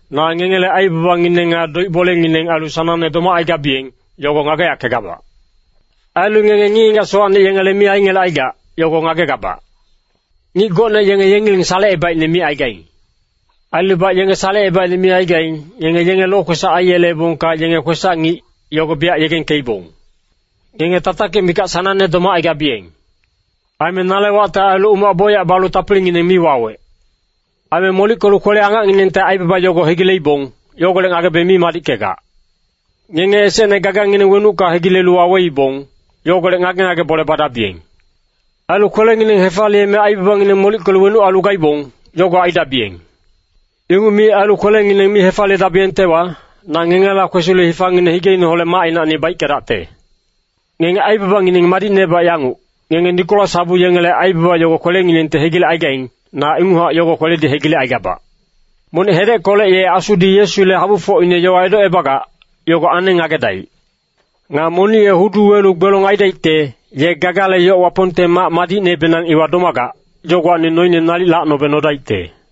‘Na ngengele aibabangineng nga doic-bolengineng ailu sanangne domacaigabiyeng, yogo ngageyackegabac. Ailu ngenge ngic-ngigac sowacne yengele mi aingelecaigac, yogo ngagegabac. Ngic gocne yenge yengileng salecebaicne micaigaing. Ailubac yenge salecebaicne mi aigaing, ngenge yenge lokwesac aiyeleebongka yenge kwesac-ngic, yogo biyac yegengkeibong. Ngenge tatakic mikac sanangne domacaigabiyeng. Aime nale wacte ailu umac bocyac balu tapilingineng mi wawec.’” “Aime molickelu kwele-angacnginengte aibaba yogo hegileibong, yogolec ngagebe mi madickegac. Ngenge esecne gagangineng wenucka hegilelu waweibong, yogolec ngage-ngage bole badabiyeng. Ailu kwelengineng hefaliyeme aibabangineng molickelu wenuc ailu gaibong, yogo aidabiyeng. Inguc mi ailu kwelengineng mi hefaliyedabiyengtewa, na ngengela kwesilu hifangineng higeineholec macinacni baickedacte. Ngenge aibabangineng madicnebac yanguc, ngenge Nikolas habu yengele aibaba yogo kwelenginengti hegilecaigaing, na inguchac yogo kweledi hegilecaigabac.” “Monic hedeckolec ye Asudi Yesule habufocine yowa edocebagac, yogo aneng ngagedaic. Nga monic ye hudu welu gbelong aidaicte, ye gagale yoc Wapongte mac madicnebenang iwa domagac, yogowacni noine nalic lacnobe nodaicte.”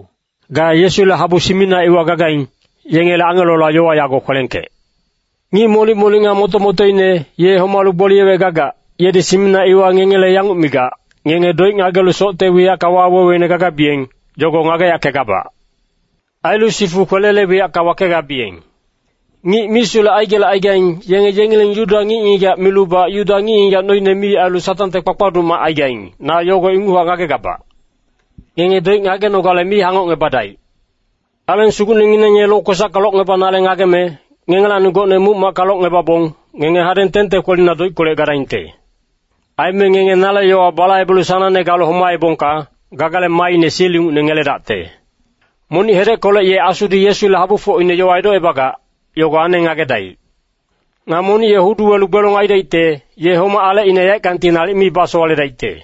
“Ga Yesule habu Simina iwa gagaing, yengele angelola yowa yago kwelengkec.” “Ngic molic-molic nga moto-motoine, ye homalu gboliyewec gagac, yedi Simina iwa ngengele yanguc migac, Ngenge doic ngagelu socte wiyacka waweweine gagabiyeng, yogo ngageyackegabac. Ailu sifu kwelele wiyacka wakegabiyeng. Ngic misulec aigelecaigaing, yenge yengileng Yuda ngic-ngigac milubac Yuda ngic-ngigac noine mi ailu Satangte kpakpaduc mac aigaing, na yogo inguchac ngagegabac. Ngenge doic ngagenogale mi hangocngebadaic. Aleng Sugucnengineng ye lokwesacka locngebanale ngageme, ngengelacni gocne muc-macka locngebabong, ngenge hadeng 10te kwelina doickolec gadaingte. Aime ngenge nale yowa balaibelu sanangne galu homaebongka, gagale maaine sil ingucne ngeledacte.” “Monic hedeckolec ye Asudi Yesule habufocine yowa edocebagac, yogo aneng ngagedaic. Nga monic ye hudu welu gbelong aidaicte, ye homac alecine yaeckangti nalic mi basowaledaicte.”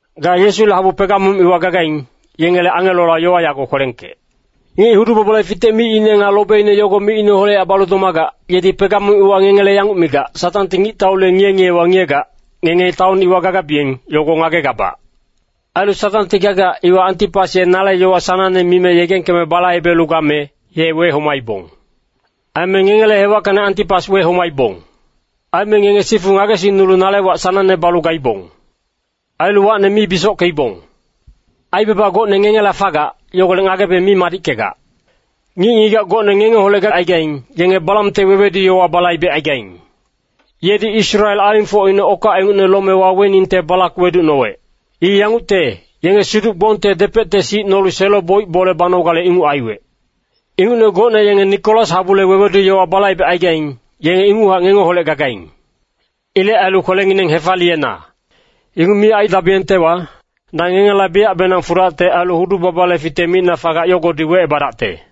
“Ga Yesule habu Pegamum iwa gagaing, yengele angelola yowa yago kwelengkec.” “Ngic hudu-babale fitec micine nga lobeine yogo micineholechac balu domagac, yedi Pegamum iwa ngengele yanguc migac, ‘Satangti ngictaule ngiye-ngiyewa ngiyegac, ngenge taon iwa gagabiyeng, yogo ngagegabac. Ailu Satangti gagac, iwa Antipas ye nale yowa sanangne mime yegengkeme balaibelu game, ye wehomaibong. Aime ngengele hewackacni Antipas wehomaibong. Aime ngenge sifu ngagesingnulu nale wac sanangne balu gaibong. Ailu wacne mi bisockeibong.’” “Aibaba gocne ngengela fagac, yogolec ngagebe mi madickegac. Ngic-ngigac gocne ngengeholec gacaigaing, yenge Balamte wewedu-yowa balaibecaigaing. Yedi Israel alingfocine okac ingucne lome waweningte Balak weducnowec. I yangucte, yenge siduc-gbongte depecte sic nolu selo-boic bole banogale inguc aiwec. Ingucne gocne yenge Nikolas habule wewedu-yowa balaibecaigaing, yenge inguchac ngengeholec gagaing. Ilec ailu kwelengineng hefaliyena. Inguc mi aidabiyengtewa, na ngengela biyacbenang fudacte ailu hudu-babale fitec micna fagac yogodi wecebadacte.”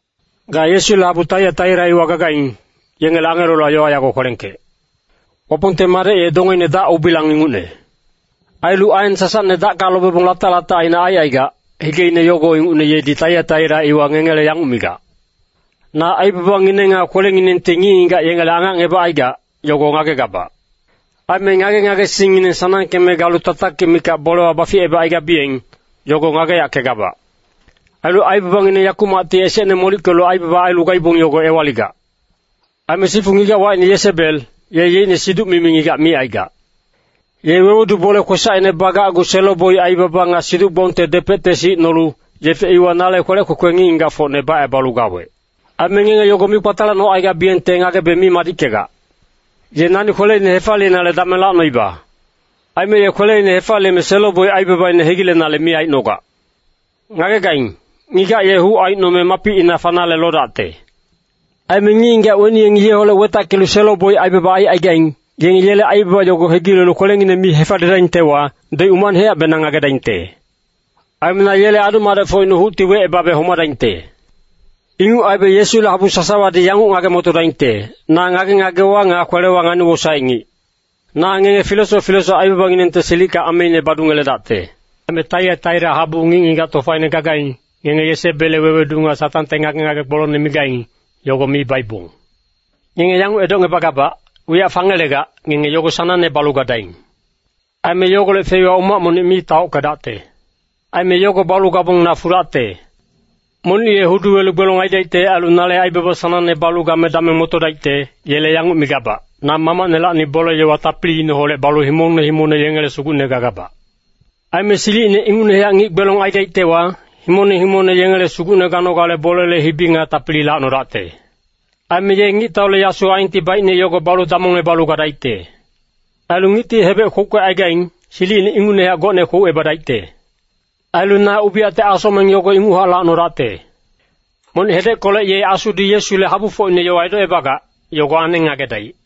“Ga Yesule habu Taiataira iwa gagaing, yengele angelola yowa yago kwelengkec.” “Wapongte Madec ye dongeine dac-ubilang ingucne. Ailu aen sasacne dacka lobebong latac-latacine aicaigac, higeine yogo ingucne, yedi Taiataira iwa ngengele yanguc migac. ‘Na aibabangineng nga kwelenginengti ngic-ngigac yengele angacngebacaigac, yogo ngagegabac. Aime ngage-ngagesingngineng sanangkeme galu tatakic mikac bolewa baficebacaigabiyeng, yogo ngageyackegabac. Ailu aibabangineng yakumacti esecne molickelu aibaba ailu gaibong yogo ewaligac.’” “Aime sifu ngigac wacine Yesebel, ye yeicne siduc-mimi ngigac micaigac. Ye wewedu bole kwesacine bagacgu selo-boic aibaba nga siduc-gbongte depecte sic nolu, yefe iwa nale kwelec kwekwe ngic-ngigacfocne bacebalu gawec. Aime ngenge yogo mi kpatalacnolu gacaigabiyengte ngagebe mi madickegac. Ye nani kweleine hefaliyenale dameng lacnoiba. Aime ye kweleine hefaliyeme selo-boic aibabaine hegilenale mi aicnogac.” “Ngagegaing, ngigac ye huc aicnome mapicina fanale lodacte. Aime ngic-ngigac weni yengi yeholec wetackelu selo-boic aibaba aicaigaing, yenge yele aibaba yogo hegilelu kwelengineng mi hefaliyedaingtewa, doic umacnehacbenang ngagedaingte. Aime na yele adu-madecfocine hucti wecebabe homadaingte. Inguc aibe Yesule habu sasawadi yanguc ngage-motodaingte, na ngage-ngagewa nga kwelewa ngani-wosaec ngic. Na ngenge filesoc filesoc aibabanginengte silicka ameine badungeledacte. Aime Taiataira habuwa ngic-ngigac tofaine gagaing, ngenge Yesebelle wewedu nga Satangte ngage-ngage gbolongne migaing, yogo mi baibong. Ngenge yanguc edocngebagabac, wiyac fangelegac, ngenge yogo sanangne balu gadaing. Aime yogolec feiwa umac monic mi taockedacte. Aime yogo balu gabong na fudacte.” “Monic ye hudu welu gbelong aidaicte ailu nale aibaba sanangne balu game dameng motodaicte, yele yanguc migabac, Na Mamacnelacni bole-yowa tapiliineholec balu himongne himongne yengele Sugucne gagabac. Aime silicine ingucnehac ngic gbelong aidaictewa, himongne himongne yengele sugucne ganogale bolele hibi nga tapili lacnodacte. ‘Aime ye ngictaule yasu aenti baicne yogo balu damongebalu gadaicte. Ailu ngicti hebec kwouckecaigaing, silicine ingucnehac gocne kwoucebadaicte.’ Ailu na ubiyacte asocmeng yogo inguchac lacnodacte. Monic hedeckolec ye Asudi Yesule habufocine yowa edocebagac, yogo aneng ngagedaic.”